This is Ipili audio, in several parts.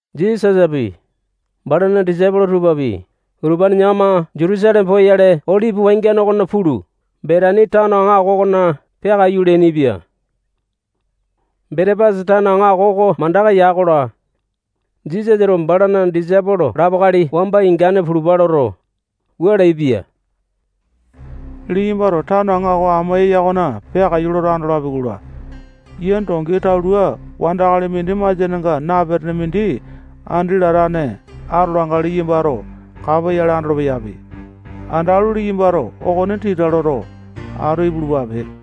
Jisasapi, balana disaipolo tupapi, utupane yakama Jutusaleme poyale Olipi wangiane okona pulu, Betani tano aŋako okona peakaiyu leainipia. Betepasi tano aŋako oko mandaka ya-kola, Jisasato balana disaipolo lapo akali wamba ingane pulupa loto, wua leaipia: Liyambato tano aŋako amo eya okona peakaiyu loto andolapi-kola, yia dongi talua wandakali mindi masianenga napetene mindi andi latane atolanga liyambato kapoyale andolo-peyapi. Andalu, liyambato okone tita loto, atu ipulupape.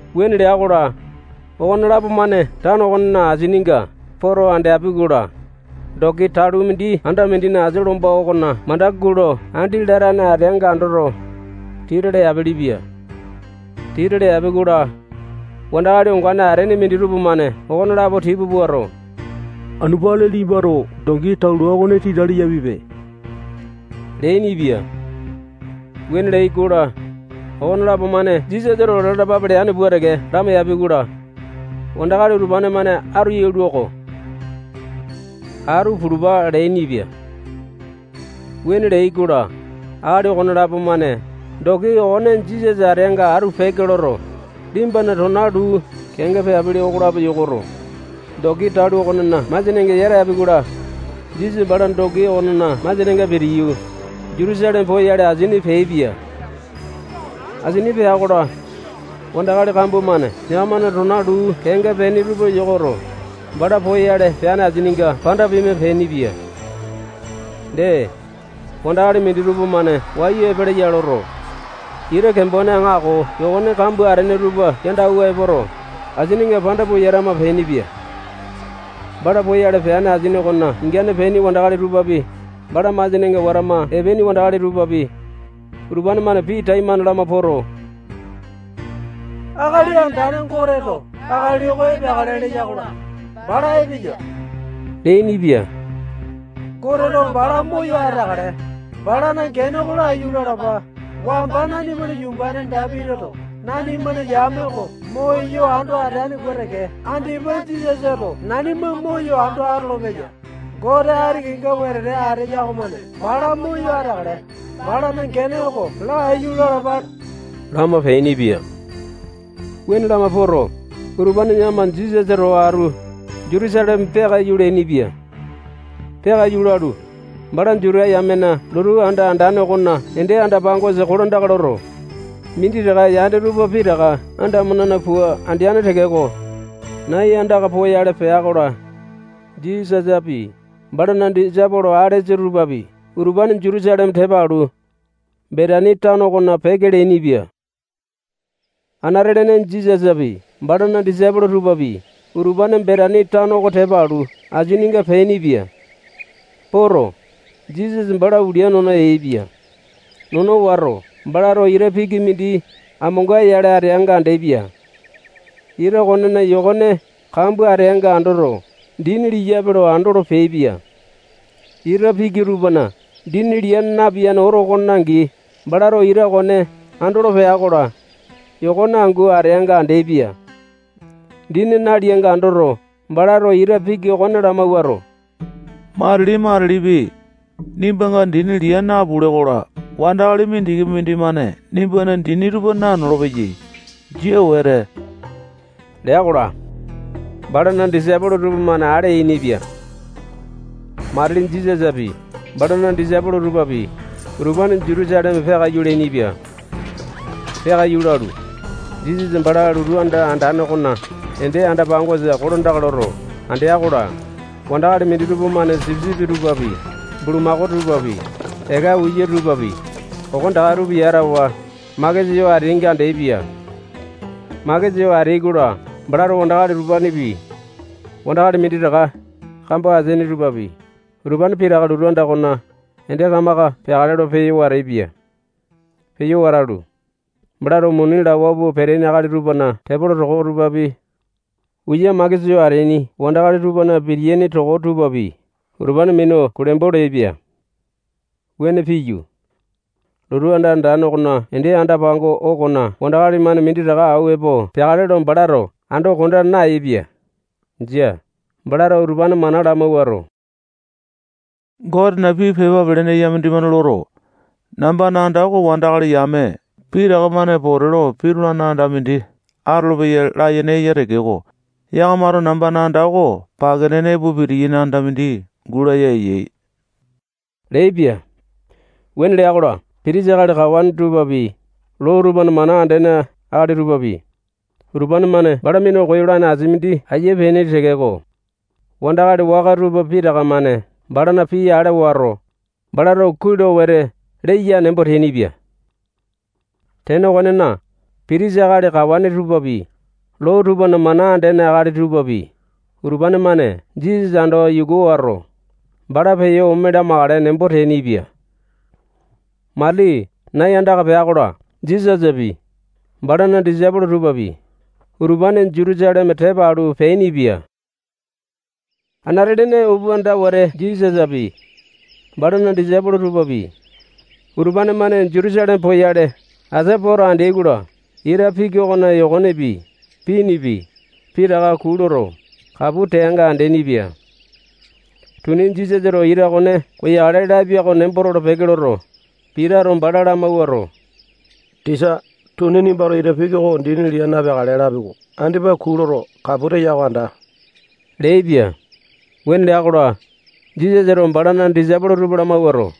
Wuane lea-kola, okonelapo-mane tano okonena asininga poto andeapi-kola, dongi talua mindi anda mindina asia lomba okona mandaka gulo andi latane ateanga andoto, tita leapelepia. Tita leapi-kola, wandakali ongane ateaini minditupa-mane okonelapo tipa puato, anu peakale liyambato dongi talua okone tita leyapipe leainipia. Wuane leai-kola, okonelapo-mane Jisasato lalapape leane pua teke lamaiyapi-kola, wandakali utupane-mane atu yalua-ko. Atu pulupa leainipia. Wuane leai-kola, akali okonelapo-mane dongi okone Jisasa ateanga atu peke loto, liyambana tona luu kenga peapili okolapo yokoto, dongi talua okonena masianenga yata yapi-kola, Jisasa bala dongi okonena masianenga pitiyu, Jutusaleme poyale, asini peaipia. Asini pea-kola, wandakali kambua-mane yakamana tona luu kenga peaini tupa yokoto, bala poyale peane asininga panda pima peainipia. Dee, wandakali minditupa-mane wayu epeleya loto, ita kembone aŋako yokone kambua atene tupa yando awua epoto, asininga panda pua yatama peainipia. Bala poyale peane asini okona ingane peaini wandakali tupapi, bala masianenga watama epeaini wandakali tupapi, utupane-mane pii taimane lama poto, Akali Andane Goteto akali oko epeakale leya-kola, bala epeya leainipia. Goteto bala moyo ateakale. Balana gene oko laiyu lalapa. Wamba nanimana yumbane Dapitito nanimana yame oko moyo ando ateane pua teke, andipa Jisasato nanima moyo ando atolopeya. Gote ati kenga wetete ateya okomane bala moyo ateakale. Balana gene oko laiyu lalapa lama peainipia. Wuane lama poto, utupane yakama Jisasa towa atu Jutusaleme peakaiyu leainipia. Peakaiyu lalu, bala Juta yamena lotu anda andane okona ende anda-pangosa kolandaka loto, minditaka yane tupa pitaka andamo-nena pua andeane tekeko, nai andaka poyale pea-kola, Jisasapi, balana disaipolo alesa tupapi, utupane Jutusaleme tepa alu, Betani tano okona peke leainipia. Anate-lene Jisasapi, balana disaipolo tupapi, utupane Betani tano oko tepa alu, asininga peainipia. Poto, Jisasa bala ulia nono yaepia. Nono wato, balato ita piki mindi amonga-yale ateanga andeapia. Ita okonena yokone kambua ateanga andoto, dini liyape lo andolo peaipia. Ita piki tupana dini lia napiyane oto okone angi, balato ita okone andolo pea-kola, yokone angu ateanga andeaipia. Dini nalianga andoto, balato ita piki okone lamawuato, matili-matilipi, nimbanga dini lia napule-kola, wandakali mindikipi mindimane nimbana dini tupa nanolo-peyai. Jia wete lea-kola, balana disaipolo tupamane ale yainipia. Matili Jisasapi, balana disaipolo tupapi, utupane Jutusaleme peakaiyu leainipia. Peakaiyu lalu, Jisasa bala lotu anda andane okona ende anda-pangosa kolandaka loto, andea-kola, wandakali minditupa-mane sipisipi tupapi, bulamakao tupapi, eka uya tupapi, okonetaka tupa yatawa, makesa yo ateainga andeaipia. Makesa yo ateai-kola, balato wandakali utupanepi, wandakali minditaka kambo ateaini tupapi, utupane pitaka lotu anda okona ende kamaka peakale lo peyo wateaipia. Peyo watalu, balato muni lawa pua peteaini akali tupana tepolo toko tupapi, uya makesa yo ateaini wandakali tupana pitiyaini toko tupapi, utupane minu kulembo leaipia. Wuane piyu, lotu anda andane okona ende anda-pango okona wandakali-mane minditaka awua epo peakale lo balato ando konda nayaepia. Jia. Balato utupane mana lamawuato, Gotena pii pepa pelene eya mindimane loto, nambana anda oko wandakali yame pitaka-mane pote lo pitulane anda mindi atolopeya layene eya tekeko, yakamato nambana anda oko pake nene epo pitiyaini anda mindi gulaya eyai leaipia. Wuane lea-kola, pitisa akali kawane tupapi, loo tupana mana andene akali tupapi, utupane-mane bala minu koyolane asia mindi aiya peaini tekeko, wandakali waka tupa pitaka-mane balana pii ale wato, balato kuai lo wete leya nembo teainipia. Tene okonena, pitisa akali kawane tupapi, loo tupana mana andene akali tupapi, utupane-mane Jisasa ando yuku wato, bala peyo ome lamakale nembo teainipia. Matili nai andaka pea-kola, Jisasapi, balana disaipolo tupapi, utupane Jutusaleme tepa alu, peainipia. Anate-lene upanda wete Jisasapi, balana disaipolo tupapi, utupane-mane Jutusaleme poyale asia poto andeai-kola, ita piki okona yokonepi, pinipi, pitaka kuu loto, kapu teanga andeaini-pia. Tuni Jisasato ita okone koyakale lapia oko nembo tolo-peke loto, Pitato bala lamawuato, tisa, tuni nimbato ita piki oko dini lia napeakale lapi-ko. Andipa kuu loto, kapu teya oko anda leaipia. Wuane lea-kola, Jisasato balana disaipolo tupa lamawuato,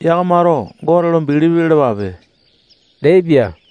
yakamato Gote lo bilipi lalapape leaipia.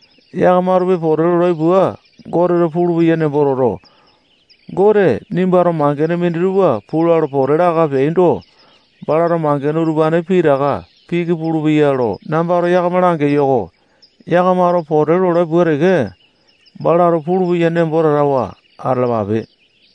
Yakamatopi pote lolai pua, Goteto pulupeya nembo toto, Gote nimbato mangene minditupa pula lo pote laka peaindo, balato mangene utupane pitaka piki pulupeya lo nambato yakama langeyo-ko. Yakamato pote lolai pua teke balato pulupeya nembo tatawa atalapape.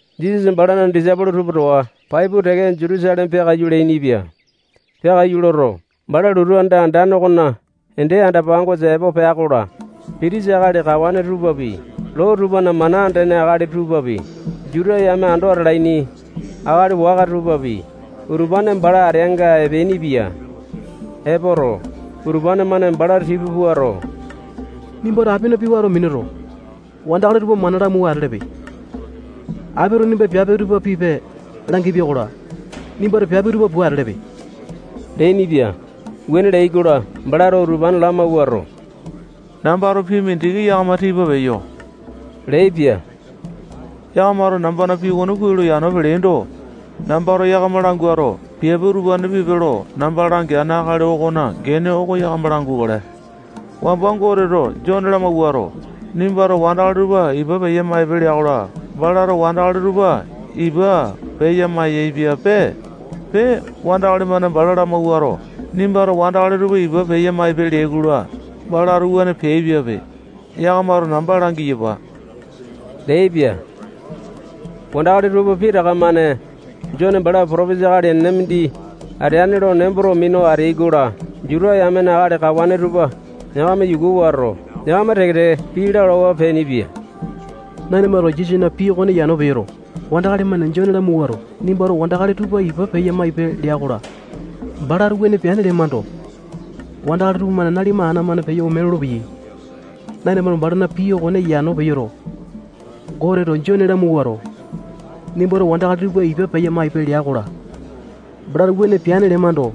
Jisasa balana disaipolo tupa towa pai pua teke Jutusaleme peakaiyu leainipia. Peakaiyu loto, bala lotu anda andane okona ende anda-pangosa epo pea-kola, pitisa akali kawane tupapi, loo tupana mana andene akali tupapi, Juta yame ando atalaini akali waka tupapi, utupane bala ateanga epeainipia. Epoto, utupane-mane bala tipa puato, nimbato apina pii wato minuto, wandakali utupa mana lamawua atelepe. Apito nimba piape utupa pipe langipia-kola, nimbato piape utupa pua atelepe leainipia. Wuane leai-kola, balato utupane lamawuato, nambato pii mindiki yakama tipa peyo leaipia. Yakamato nambana pii okone kuai lo yano peleaindo, nambato yakama languato, piape utupane pipe lo namba langeane akali okona gene oko yakama langukale. Wamba Goteto Jone lamawuato, nimbato wandakali tupa ipa peya-maipe lea-kola, balato wandakali tupa ipa peya-maiyaepiape. Pee, wandakali-mane bala lamawuato, nimbato wandakali tupa ipa peya-maipe leai-kola, balato wuane peaipiape. Yakamato namba langiyapa leaipia. Wandakali tupa pitaka-mane Jone bala potopesa akali enene mindi ateane lo nemboto minu ateai-kola, Juta yamena akali kawane tupa yakama yuku wato, yakama teke-teke pii lalawa peainipia. Nanimato Jisasana pii okone yano peyoto, wandakali-mane Jone lamawuato, nimbato wandakali tupa ipa peya-maipe lea-kola, balato wuane peane lemando, wandakali tupamane nanima ana-mane peyo ome lolopeyai. Nanimato balana pii okone yano peyoto, Goteto Jone lamawuato, nimbato wandakali tupa ipa peya-maipe lea-kola, balato wuane peane lemando,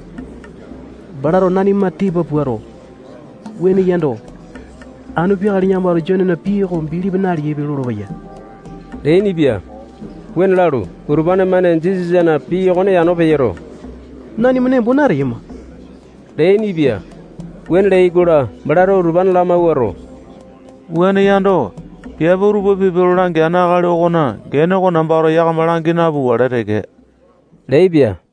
balato nanima tipa puato, wuane yando, anu peakale yakamato Jonena pii oko bilipi naleaipe lolopeya leainipia. Wuane lalu, utupane-mane Jisasana pii okone yano peyoto, nanima nembo nateyama leainipia. Wuane leai-kola, balato utupane lamawuato, wuane yando, piape utupa pipe lo langeane akali okona gene oko nambato yakama langi napukale teke leaipia.